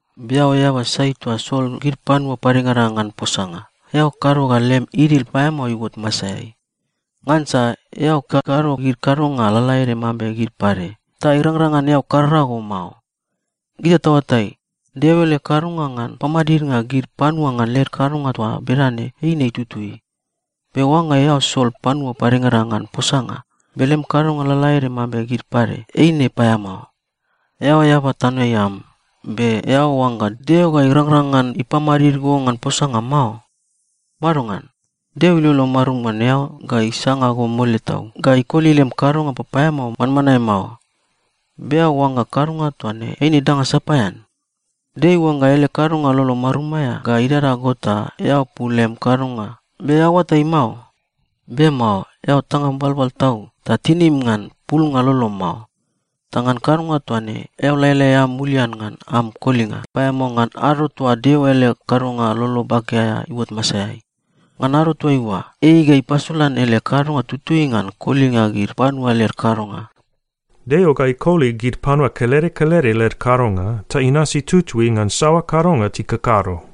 Be eao eaba sai toa sol gid panua padengada ngan posanga, eao kado ga lem idil paeamao iuot masaeai, ngansa eao kakado gid kadonga lalaede mambe gid pade, ta irangrang ngan eao karara go mao. Gita taoatai, Deo ele kadonga ngan pamadidnga gid panua ngan led kadonga toa bedane eine tutui. Be oangga eao sol panua padengada ngan posanga, be lem kadonga lalaede mambe gid pade, eine paeamao. Eao eaba tanoeai am, be eao oangga Deo ga irangrang ngan ipamadid go ngan posanga mao? Madongan? Deo ilolo marum ngan eao ga isanga go mole tau, ga ikoli lem kadonga papaeamao manmanae mao. Be eao oangga kadonga toa ne eine danga sapaean? Deo iuangga ele kadonga lolo marum aea ga idada go ta eao pul lem kadonga. Be eao oatai mao? Be mao. Eao tangam balbal tau ta tinim ngan pulnga lolom mao. Ta ngan kadonga toa ne, eao laelae am mulian ngan am kolinga paeamao ngan ado toa Deo ele kadonga lolo bake aea iuot masaeai. Ngan ado toaiua, ei ga ipasolan ele kadonga tutui ngan kolinga gid panua led kadonga. “Deo ga ikoli gid panua kelede kelede led kadonga, ta inasi tutui ngan saoa kadonga tikakado.”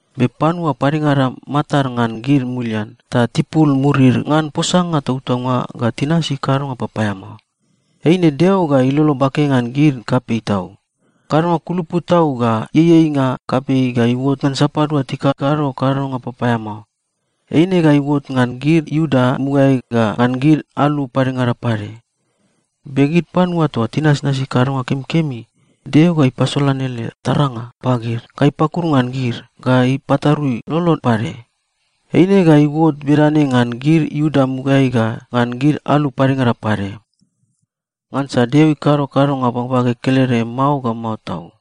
Be panua padengada matad ngan gid mulian, ta tipul murid ngan posanga tautaunga ga tinasi kadonga papaeamao. Eine Deo ga ilolo bake ngan gid kapei tau. Kadonga kulupu tau ga ieieinga kapei ga iuot ngan sapadua tikakado kadonga papaeamao. Eine ga iuot ngan gid Iuda mugaeai ga ngan gid alu padengada pade. Be gid panua toa tinasnasi kadonga kemikemi, Deo ga ipasolan ele taranga pagid, ga ipakuru ngan gid, ga ipatarui lolod pade. Eine ga iuot bedane ngan gid Iuda mugaeai ga ngan gid alu padengada pade. Ngansa Deo ikado kadonga bagbage kelede mao ga mao tau.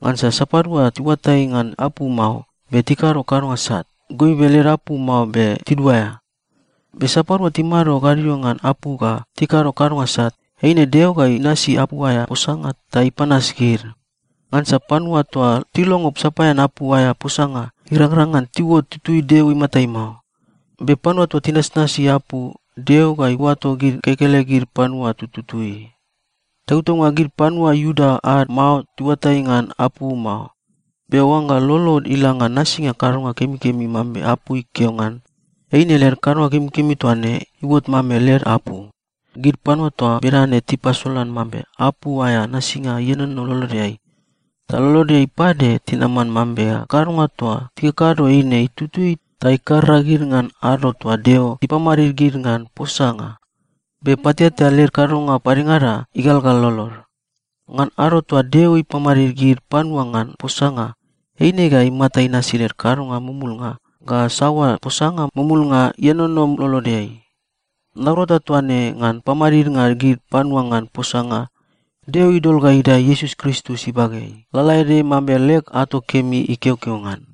Ngansa sapadua tiuatai ngan apu mao, be tikado kadonga sat, goibe led apu mao be tiduaea. Be sapadua timado gadio ngan apu ga tikado kadonga sat, eine Deo ga inasi apu aea posanga ta ipanas gid. Ngansa panua toa tilongo sapaean apu aea posanga, irangrang ngan tiuot tutui Deo imatai mao. Be panua toa tinasnasi apu, Deo ga iuato gid kekelegid panua tututui. Tautaunga gid panua Iuda ad mao tiuatai ngan apu mao, be oangga lolod ila ngan nasinga kadonga kemikemi mambe apu ikeo ngan, eine led kadonga kemikemi toa ne iuot mambe led apu. Gid panua toa bedane tipasolan mambe apu aea nasinga ienono lolodeai. Ta lolodeai pade tinaman mambe kadonga toa tikakado eine tutui ta ikarara gid ngan ado toa Deo ipamadid gid ngan posanga. Be pateatea led kadonga padengada igalgal lolod. Ngan ado toa Deo ipamadid gid panua ngan posanga, eine ga imata inasi led kadonga mumulnga ga saoa posanga mumulnga ienono lolodeai. Naurata toa ne ngan pamadidnga gid panua ngan posanga, Deo idol ga idae Iesus Kristus ibageai, lalaede mambe leg ato kemi ikeokeo ngan.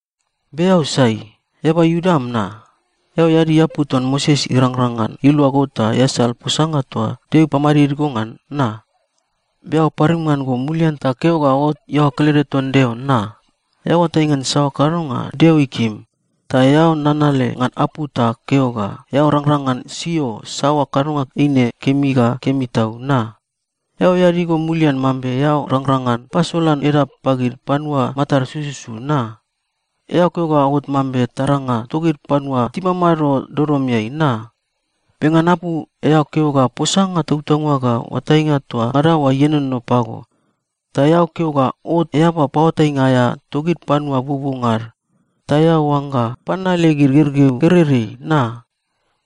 Be eao sai? Eaba Iuda am, na? Eao eadi apu ton Moses irangrang ngan ilua go ta easal posanga toa Deo ipamadid go ngan, na? Be eao parim ngan go mulian ta keo ga ot iaoa kelede ton Deo, na? Eao oatai ngan saoa kadonga Deo ikim, ta eao nanale ngan apu ta keo ga eao rangrang ngan sio saoa kadonga eine kemi ga kemi tau, na? Eao eadi go mulian mambe eao rangrang ngan pasolan edap pagid panua matad sususu, na? Eao keo ga ot mambe taranga togid panua timamado dodomeai, na? Be ngan apu, eao keo ga posanga tautaunga ga oatainga toa ngada oa ienono pago. Ta eao keo ga ot eaba paoatainga aea togid panua buobuonga ad, ta eao oangga pananale gid gergeu gereirei, na?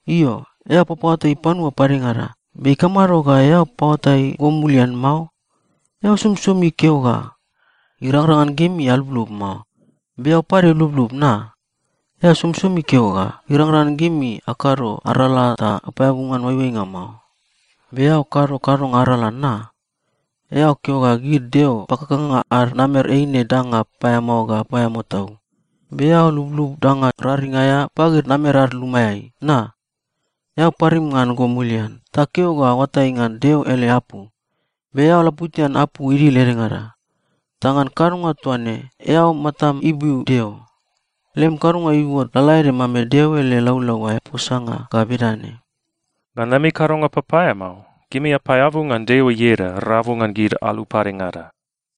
Io, eao papaoatai panua padengada, be ikamado ga eao paoatai go mulian mao? Eao somisomi keo ga, “Irangrang ngan gimi alublub mao.” Be eao pade lublub, na? Eao somisomi keo ga, “Irangrang ngan gimi akado arala ta apaeabu ngan oaioainga mao.” Be eao kado kadonga arala, na? Eao keo ga gid deo pakakanga ad namer eine danga paeamao ga paeamao tau. Be eao lublub danga raring aea pagid namer ad lumaeai, na? Eao parim ngan go mulian ta keo ga oatai ngan Deo ele apu. Be eao laputian apu idil edengada, ta ngan kadonga toa ne eao matam ibiu Deo. Lem kadonga iuot lalaede mambe Deo ele laulau aea posanga ga bedane, “Ngan lemi kadonga papaeamao, gimi apaeabu ngan Deo ieda rabu ngan gid alu padengada.”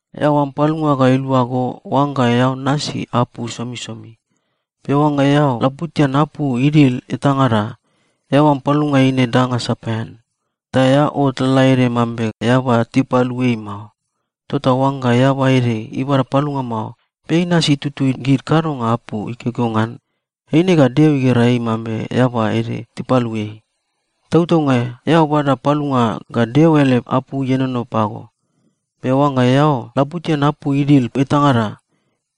Eao am palunga ga ilua go oangga eao nasi apu somisomi. Be oangga eao laputian apu idil etangada, eao am palunga eine danga sapaean. Ta eao ot lalaede mambe eaba tipalu ei mao. Tota oangga eaba ede ibada palunga mao, be inasi tutui gid kadonga apu ikeokeo ngan, eine ga Deo igera ei mambe eaba ede tipalu ei. Tautaunga eao bada palunga ga Deo ele apu ienono pago, be oangga eao laputian apu idil etangada,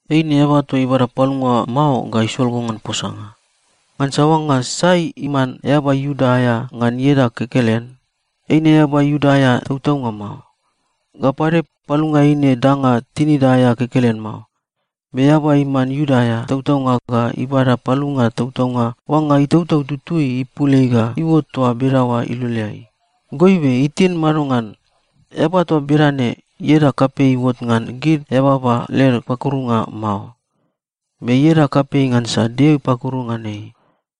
eine eaba toa ibada palunga mao ga isol go ngan posanga. Ngansa oangga sai iman eaba Iuda aea ngan ieda kekelen, eine eaba Iuda aea tautaunga mao. Ga pade, palunga eine danga tinida aea kekelen mao. Be eaba iman Iuda aea tautaunga ga ibada palunga tautaunga oangga Itautau Tutui ipul ei ga iuot toa bedaoa iloleai. Goibe itin madongan. Eaba toa bedane, ieda kapei iuot ngan gid eababa led pakurunga mao, be ieda kapei ngansa Deo ipakuru ngan ei.